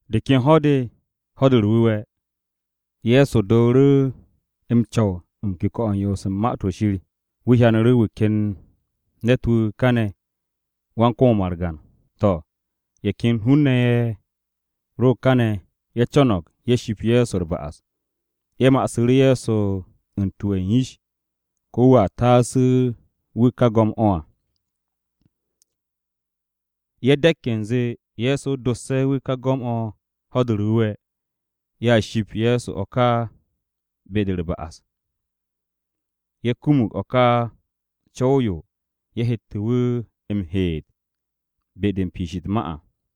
De ken ho̱-de, Ho̱-de u̱r-Wu̱we̱, Ye̱so dooru̱ m-co̱w u̱n kuke̱-o̱ u̱n yoos u̱n Ma-to̱ Shir. Wu̱ hyanu̱ru̱ wu̱ ken ne̱t-wu̱ kane̱ wan-kom-o margan. To̱, ye̱ ken hun-ne̱ ye̱ ro kane̱ ye̱ co̱no̱g ye̱ shipk Ye̱so u̱r-ba'as. Ye̱ ma'asu̱ru̱ Ye̱so u̱n tuwe̱ u̱n yish ko̱ wu̱a taasu̱ wu̱ ka go̱m-o̱ o-kom à. Ye̱ de̱k u̱nze Ye̱so dosse̱ wu̱ ka go̱m-o̱ Ho̱-de u̱r-Wu̱we̱, ye̱ ship Ye̱so o̱ ká be-de u̱r-ba'as. Ye̱ kumug o̱ ka co̱w-yo ye̱ hette̱ wu̱ m-heet be-de u̱n piish u̱t-ma à.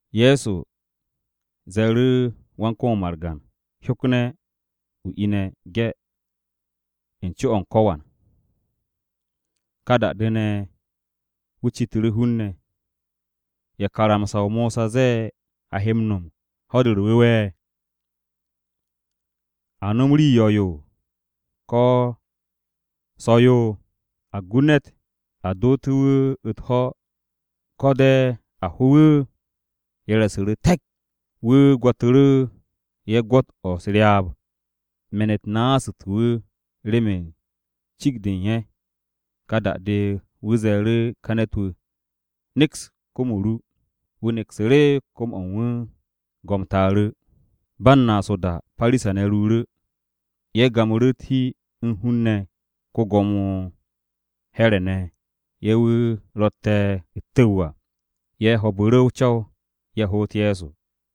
Ye̱so ze̱e̱ru̱ wan-kom-o margan, “Hyokne̱ o ine̱ ge̱ u̱n co-o̱ u̱n ko̱wan.” Ka da-de ne̱, wu̱ citu̱ru̱ hun-ne̱, “¿Ya karamsa-o Mosa ze̱e̱ a he m-no̱m Ho̱-de u̱r-Wu̱we̱? ¿A nom rii yo̱-yo, ko̱ o-so̱-yo? ¿A gu ne̱t a doote̱ wu̱ u̱t-ho̱, ko̱ de̱ a ho wu̱?” Ye̱ re̱su̱ru̱ te̱k. Wu̱ gwo̱tu̱ru̱ ye̱ gwo̱t-o̱ u̱s-ryaab. Me̱n-u̱t naasu̱te̱ wu̱ remen cikt-de u̱n ye̱. Ka da-de, wu̱ ze̱e̱ru̱ ka ne̱t-wu̱, “Neks kom-o ru.” Wu̱ neksu̱ru̱ kom-o̱ u̱n wu̱. Go̱m taaru̱. Ba u̱n naas o-da Parisa-ne̱ ruuru̱, ye̱ gamu̱ru̱ u̱t-hi u̱n hun-ne̱ ko-Gwo̱mo Here̱ ne̱ ye̱ wu̱ ro̱tte̱ u̱t-tu̱w à. Ye̱ ho̱o̱bu̱ru̱ o-co̱w ye̱ hoot Ye̱so.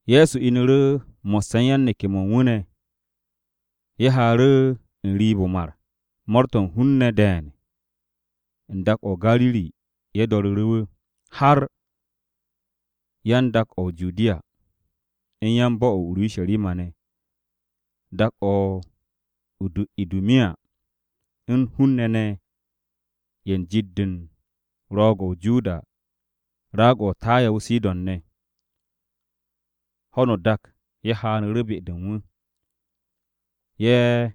Ye̱so inu̱ru̱ mo̱sse̱ u̱n yan-neke̱-mo̱ u̱n wu̱ ne̱. Ye̱ haaru̱ n-riib o̱ o-mar. Mo̱o̱r-to̱ u̱n hun-ne̱ de̱e̱n u̱n dak-o̱ o-Gariri ye̱ do̱ru̱ru̱ wu̱, har yan-dak-o̱ o-Judiya, u̱n yan-bo̱-o̱ o-Urusharima ne̱, dak-o̱ o-Idumiya, u̱n hun-ne̱ ne̱ ye̱ u̱n jit-de u̱n Ro̱o̱g-o̱ o-Joda, raag-o̱ o-Taya o-Sidon ne̱. Ho̱no o-dak ye̱ haanu̱ru̱ be-de u̱n wu̱. Ye̱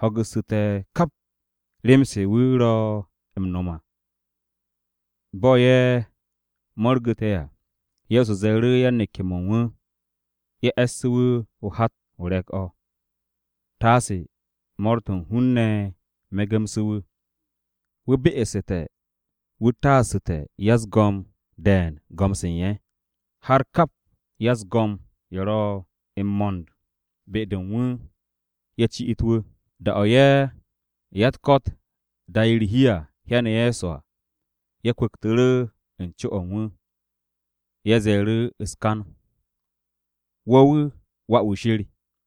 ho̱gu̱su̱te̱ kap rem-se wu̱ ro̱ m-no̱m à. Bo̱ ye̱ mo̱rgu̱te̱ à, Ye̱so ze̱e̱ru̱ yan-neke̱-mo̱ u̱n wu̱ ye̱ e̱ssu̱ wu̱ hat-o re̱k-o̱, taase mo̱o̱r-to̱ u̱n hun-ne̱ me̱gu̱mse̱ wu̱. Wu̱ be'esu̱te̱ wu̱ taasu̱te̱ ya-u̱s-go̱m de̱e̱n go̱m-se u̱n ye̱, har kap ya-u̱s-go̱m ye̱ ro m-mo̱nd be-de u̱n wu̱ ye̱ ci'it wu̱. Da-o̱ ye̱ ya-u̱t-ko̱t da'e̱ u̱r-hi à, hyane̱ Ye̱so à, ye̱ kwu̱ktu̱ru̱ u̱n co-o̱ u̱n wu̱. Ye̱ ze̱e̱ru̱ u̱s-kan, “Wo̱ wu̱ Wà-wu̱ Shir.”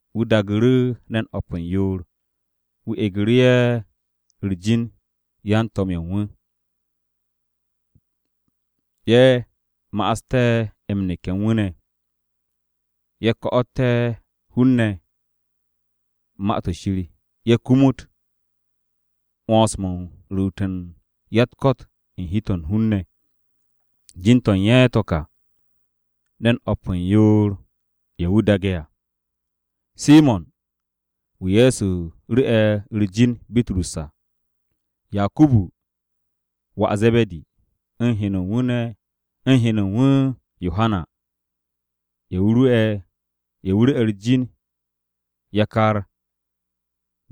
Wu̱ daagu̱ru̱ ne̱n o̱p u̱n yoor, wu̱ egu̱ru̱ ye̱ u̱r-jin yan-To̱m ye̱ u̱n wu̱. Ye̱ ma'aste̱ m-neke̱ u̱n wu̱ ne̱, ye̱ ko̱tu̱té̱ hun-ne̱ Ma-to̱ Shir, ye̱ kumut 'wo̱ns-mo̱ u̱n ruut u̱n ya-u̱t-ko̱t u̱n hi-to̱ u̱n hun-ne̱. Jin-to̱ u̱n ye̱ to̱ ka, ne̱n o̱p u̱n yoor-ye̱ wu̱ daage̱ à: Simo̱n (wu̱ Ye̱so ru̱'e̱ u̱r-jin Bitrus à), Yakubu (wà Ze̱be̱di), u̱n heno u̱n wu̱ Yohana (ye̱ wu̱ ru̱'e̱ u̱r-jin yakar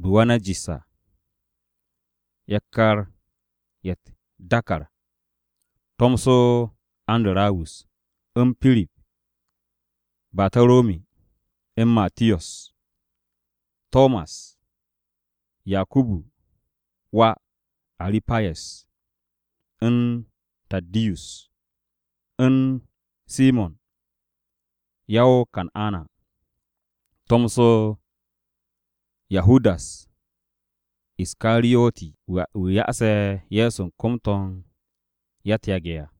Buwanajis à, yakar-ye̱ u̱t-dàkàr), tomso Andarawus, u̱n Pirip, Bataromi, u̱n Matiyos, Tomas, Yakubu (wà Aru̱payes), u̱n Taddiyus, u̱n Simo̱n (ya o-Kan'ana), tomso Yahudas Iskariyoti wu̱ (wu̱ ya'ase̱ Ye̱so u̱n kom-to̱ u̱n ya-u̱t-yage̱ à).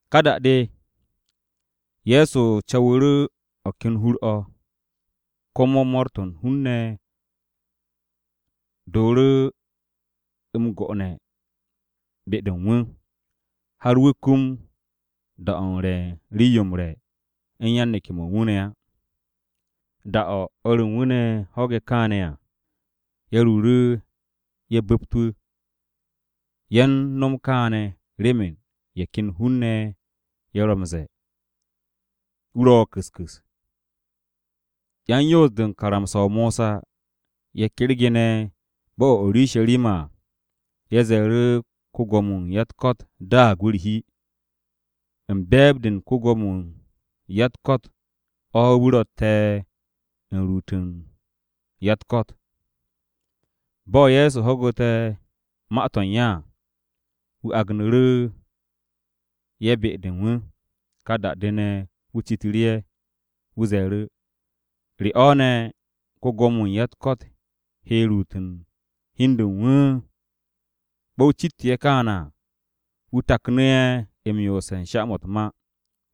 Ka da-de, Ye̱so co̱wu̱ru̱ o̱ ken hur-o̱, komo mo̱o̱r-to̱ u̱n hun-ne̱ dooru̱ m-go'one̱ be-de u̱n wu̱, har wu̱ kum da-o̱ u̱n re̱ u̱n rii-yo m-re̱ u̱n yan-neke̱-mo̱ u̱n wu̱ ne̱ á. Da-o̱ o̱r u̱n wu̱ ne̱ ho̱ge̱ kaane̱ à, ye̱ ruuru̱ ye̱ bu̱pt wu̱. Ye̱ u̱n no̱m kaane̱ remen ye̱ ken hun-ne̱ ye̱ ro̱ m-ze̱e̱, “Wu̱ ro̱ ku̱s ku̱s.” Yan-Yoos-de u̱n karamsa-o Mosa ye̱ kergene̱ bo̱-o̱ o-Urusharima à, ye̱ ze̱e̱ru̱, “Ko-Gwo̱mo-wu̱ u̱n ya-u̱t-ko̱t daag wu̱ u̱r-hi. U̱n be̱e̱b-de u̱n ko-Gwo̱mo-wu̱ u̱n ya-u̱t-ko̱t o̱ wu̱ ro̱tte̱ u̱n ruut u̱n ya-u̱t-ko̱t.” Bo̱ Ye̱so ho̱gu̱te̱ ma-to̱ u̱n ye̱ à, wu̱ agnu̱ru̱ ye̱ be-de u̱n wu̱. Ka da-de ne̱, wu̱ citu̱ru̱ ye̱. Wu̱ ze̱e̱ru̱, “¿Re o̱ ne̱ ko-Gwo̱mo-wu̱ u̱n ya-u̱t-ko̱t he ruut u̱n hi u̱n de u̱n wu̱?” Bo̱ wu̱ citte̱ ye̱ kaane̱ à, wu̱ taknu̱ ye̱ m-yoose̱ u̱n sha-mo̱ u̱t-ma.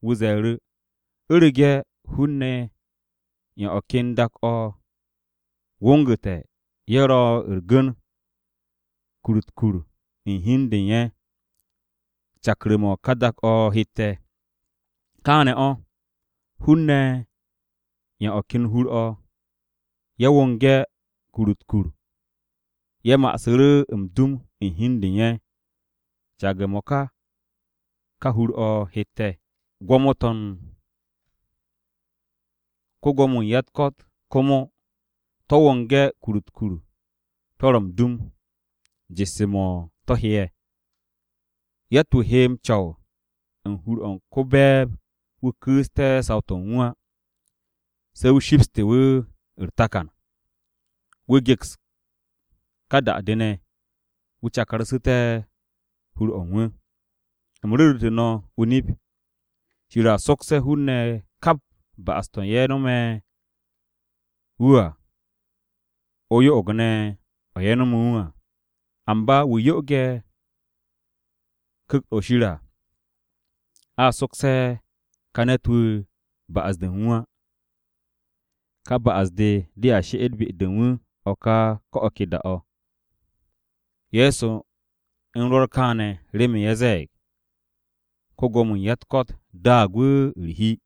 Wu̱ ze̱e̱ru̱, “U̱rege̱ hun-ne̱ ye̱ u̱n o̱ ken dak-o̱ wongu̱te̱ ye̱ ro̱ u̱r-gu̱n kur-u̱t u̱t-kur u̱n hi u̱n de u̱n ye̱, cakru̱-mo̱ ka dak-o̱ hette̱. Kaane̱ o̱, hun-ne̱ ye̱ u̱n o̱ ken hur-o̱, ye̱ wonge̱ kur-u̱t u̱t-kur. Ye̱ ma'asu̱ru̱ m-dum u̱n hi u̱n de u̱n ye̱, caage̱-mo̱ ka, ka hur-o̱ hette̱. Gwo̱mo-to̱ u̱n ko-Gwo̱mo-wu̱ u̱n ya-u̱t-ko̱t komo, to̱ wonge̱ kur-u̱t u̱t-kur, to̱ ro̱ m-dum, jesse̱-mo̱, to̱ he'e̱. Yatt-wu̱ he m-co̱w u̱n hur-o̱ u̱n ko-be̱e̱b-wu̱ ku̱u̱ste̱ saw-to̱ u̱n wu̱ á, se̱ wu̱ shipste̱ wu̱ u̱r-takan. Wu̱ geks ka da-de ne̱, wu̱ cakarsu̱te̱ hur-o̱ u̱n wu̱. Nip-o̱ me̱ no̱ m-ru̱re̱, Shir a sokse̱ hun-ne̱ kap ba'as-to̱ ye̱ nome̱ wu̱ à, o-yo'og ne̱ o̱ ye̱ nome̱ wu̱ à, amba wu̱ yo'oge̱ Ku̱kt-o̱ Shir à, a sokse̱ ka ne̱t-wu̱ ba'as-de u̱n wu̱ á. Ka ba'as-de dea she'et be-de u̱n wu̱ ko̱ o̱ ke da-o̱.” Ye̱so u̱n rwo̱r kaane̱, remen ye̱ ze̱e̱g, “Ko-Gwo̱mo-wu̱ u̱n ya-u̱t-ko̱t daag wu̱ u̱r-hi.”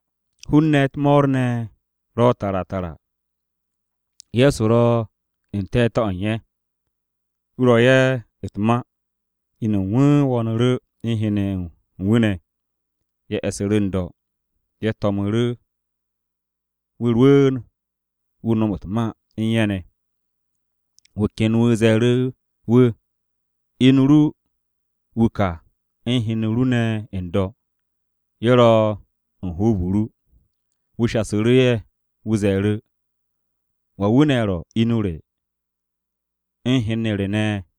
Hun-ne̱ u̱t-mo̱o̱r ne̱ ro tara tara. Ye̱so ro n-te̱te̱ o̱ u̱n ye̱. Wu̱ ro ye̱ u̱t-ma, inu u̱n wu̱ wo̱o̱nu̱ru̱ u̱n hen-ne̱ ye̱ u̱n wu̱ ne̱. Ye̱ e̱su̱ru̱ n-do̱. Ye̱ to̱mu̱ru̱ wu̱ rwu̱u̱n wu̱ nom u̱t-ma u̱n ye̱ ne̱. Wu̱ ken wu̱ ze̱e̱ru̱ wu̱, “Inu ru wu̱ ka u̱n hen-ne̱ ru ne̱ n-do̱. Ye̱ ro̱ u̱n hoob-o ru.” Wu̱ shasu̱ru̱ ye̱, wu̱ ze̱e̱ru̱, “¿Wan wu̱ ne̱ ro̱ inu re u̱n hen-ne̱ re ne̱?”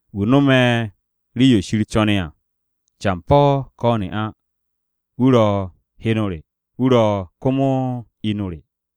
Wu̱ no̱me̱ rii-yo Shir co̱ne̱ à, campo̱, ko̱ ne'a, wu̱ ro̱ heno re, wu̱ ro̱ komo inu re.”